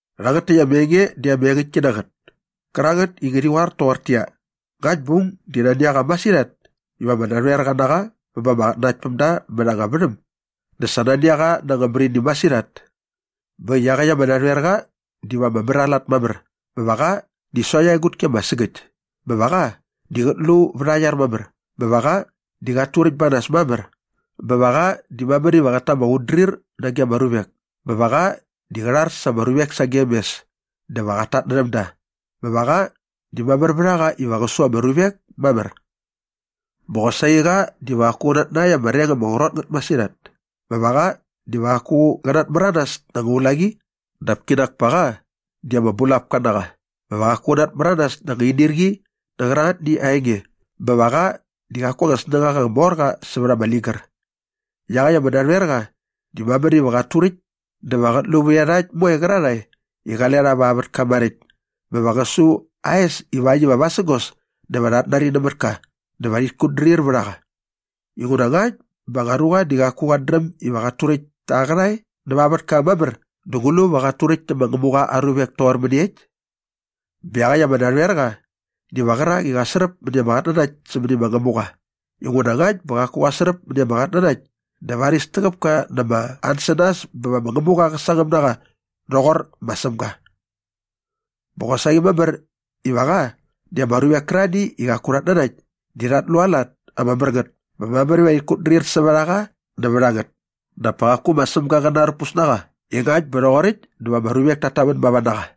Rhangät täkt ama enge di ama engäktki na ngät kärangät i ngärhi qoar toqortäqyia, ngakt bä aung di nani a qa masirhat iva ama narhoerqa na qa bä ba ama qatnanaktpämda mät anga värhäm dä sa nani a qa na anga märini masirhat. Bä äkt i iaqäkt ama narhoerqa diva ama mär aa lat mamär bä va qa di sokt aa egutki ama sägäkt bä va qa di qät lu vät aa iar mamär bä va qa di qat turäkt ba nas mamär bä va qa di mamär iva qät ta ama qutdrir nage ama ruvek bä va qa di qä rhar sa ama ruvek sagem mes dä va qat tatnärhäm da bä va qa di mamär vät a qa iva qä su ama ruvek mamär. Bä qosaqi qa diva qaku qä natnakt ama reng ama qrot ngät masirhat bä va qa diva qaku qä natmäranas na ama ulaqi dap kinak pa qa di ama bulapka na qa bä va qaku qä natmäranas na ama inirqi nä qärangätni aa enge bä va qa di qaku aa snängaqa ama mor qa sävät ama ligär. Iaqäkt ama narhoerqa di mamär iva qat turäkt dä va qät lu vät iarhakt moe qärarhae i qale rha va aa vätka maräkt bä va qä su aa es ivakt iva vasägos dä va rhat nari nämät ka dä va rhit kutdrir vät a qa. Inguna ngakt bä anga ruqa di qaku qat dräm iva qat turäkt ta aa qärhae näva aa vätka mamär dä ngu lu va qat turäkt tä ma Ngämuqa aa ruvek toqor mäniekt? Bä iaqäkt ama narhoerqa diva qärak i qa sräp mäni ama qatnanakt sämäni ma Ngämuqa inguna ngakt bä qaku qa sräp mäni ama qatnanakt dä varis täqäp ka na ama ansänas bä va ma Ngämuqa qä sangäm na qa rhoqor ma Sämga. Bä qosaqi mamär iva qa di ama ruvek kärarhani i qaku rhat nanakt di rhat lu aa lat ama mär ngät bä mamär iva rhit kutdrir sävät a qa nävät a ngät dap pa qaku ma Sämga qä narpus na qa i ngakt bä rhoqoräkt dä va ama ruvek tat tamän mava na qa.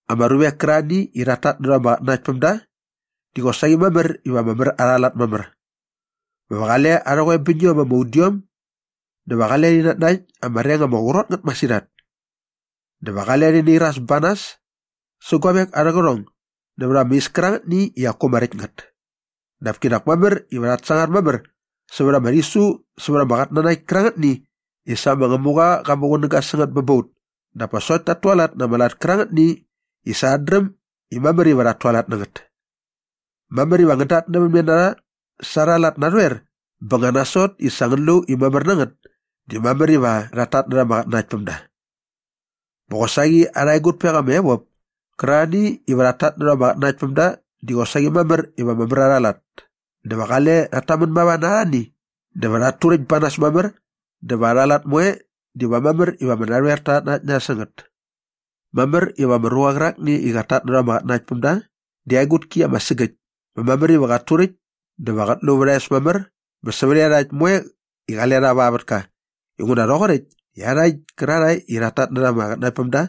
Ama ruvek kärarhani i rhat tatnärha ama qatnanaktpämda di qosaqi mamär iva ama mär arha lat mamär bä va qale arhä qoebäñiom ama udiom dä va qale rhi natnakt ama reng ama qrot ngät masirhat dä va qale rhi nairas ba nas sä guavek arhä qärhong nävät ama is kärangätni i qaku ama räkt ngät. Dap kinak mamär iva rhat sangar mamär sävät ama rhisu sävät ama qatnanakt kärangätni i sa ma Ngämuqa qa muqunäga sä ngät bä ba ut dap pa sokt tat tualat na ama lat kärangätni i sa rhat dräm i mamär iva rhat tualat na ngät. Mamär iva ngän datnävämne na rha sa arha lat narhoer bä nga nasot i sa ngän lu i mamär na ngät di mamär iva rhat tatnärha ama qatnanaktpämda. Bä qosaqi arha egutpek ama evop kärarhani iva rhat tatnärha ama qatnanaktpämda di qosaqi mamär iva ama mär arha lat dä va qale rhat tamän mava na arhani dä va rhat turäkt ba nas mamär dä va arha lat moe diva mamär iva ama narhoerta rhat nanakt na rha sä ngät. Mamär iva ama ruqa qärakni i qat tatnärha ama qatnanaktpämda di aa egutki ama sägäkt bä mamär iva qat turäkt dä va qät lu vät aa es mamär bä sävät iarhakt moe i qale rha va aa vätka inguna rhoqoräkt i iarhakt kärarhae i rhat tatnärha ama qatnanaktpämda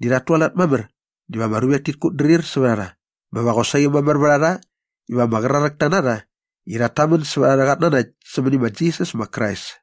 di rhat tualat mamär diva ama ruvek tit kutdrir sävät a rha bä va qosaqi mamär vät a rha iva ama qraräkta na rha i rhat tamän sävät arhä qatnanakt sämäni ma Jisas ma Krais.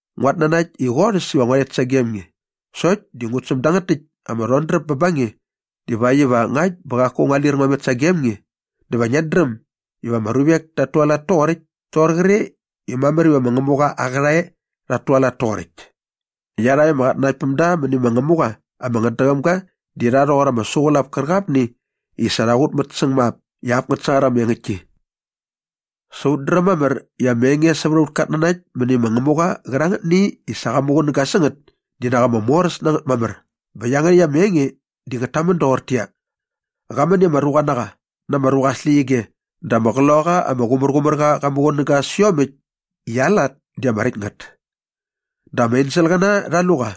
Nguat nanakt i qorhäs iva ngua rhet sagem nge sokt di ngut säm dangät täkt ama rhodräp bä ba nge divakt iva ngakt bä qaku ngua lir ngua met sagem nge dä va ngiat dräm iva ama ruvek tat tualat toqoräkt toqor qre i mamär iva ma Ngämuqa aa qärhae rhat tualat toqoräkt. Iarhakt ama qatnanaktpämda mäni ma Ngämuqa ama ngätdäqäm ga di rha rhoqor ama suqulap kärqapni i sa rha qutmät säng ma ap i ngät sangar ama engäktki. Sa ut dräm mamär i ama enge sävät aut katnanakt mäni ma Ngämuqa qärangätni i sa qa muqunäga sä ngät di nak ama moräs na ngät mamär bä iangärhäkt ama enge di ngät tamän doqortäqyia, Qa män i ama ruqa na qa na ama ruqa aa släqyige dä ama Qloqaqa ama Qumärqumärqa qa muqunäga sä iomäkt i aa lat di ama räkt ngät. Dä ama enselqäna rha lu qa.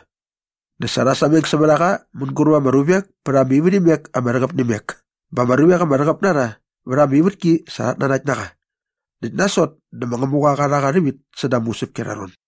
Dä sa rha sameng sävät a qa mänguräp ama ruvek pät ama ivärhimek ama rhäqäp nä imek bä ama ruvek ama rhäqäp na rha vät ama ivätki sa rhat nanakt na qa näkt nasot dä ma Ngämuqa qa rha qa rhävit säda ama usäpki arha ron.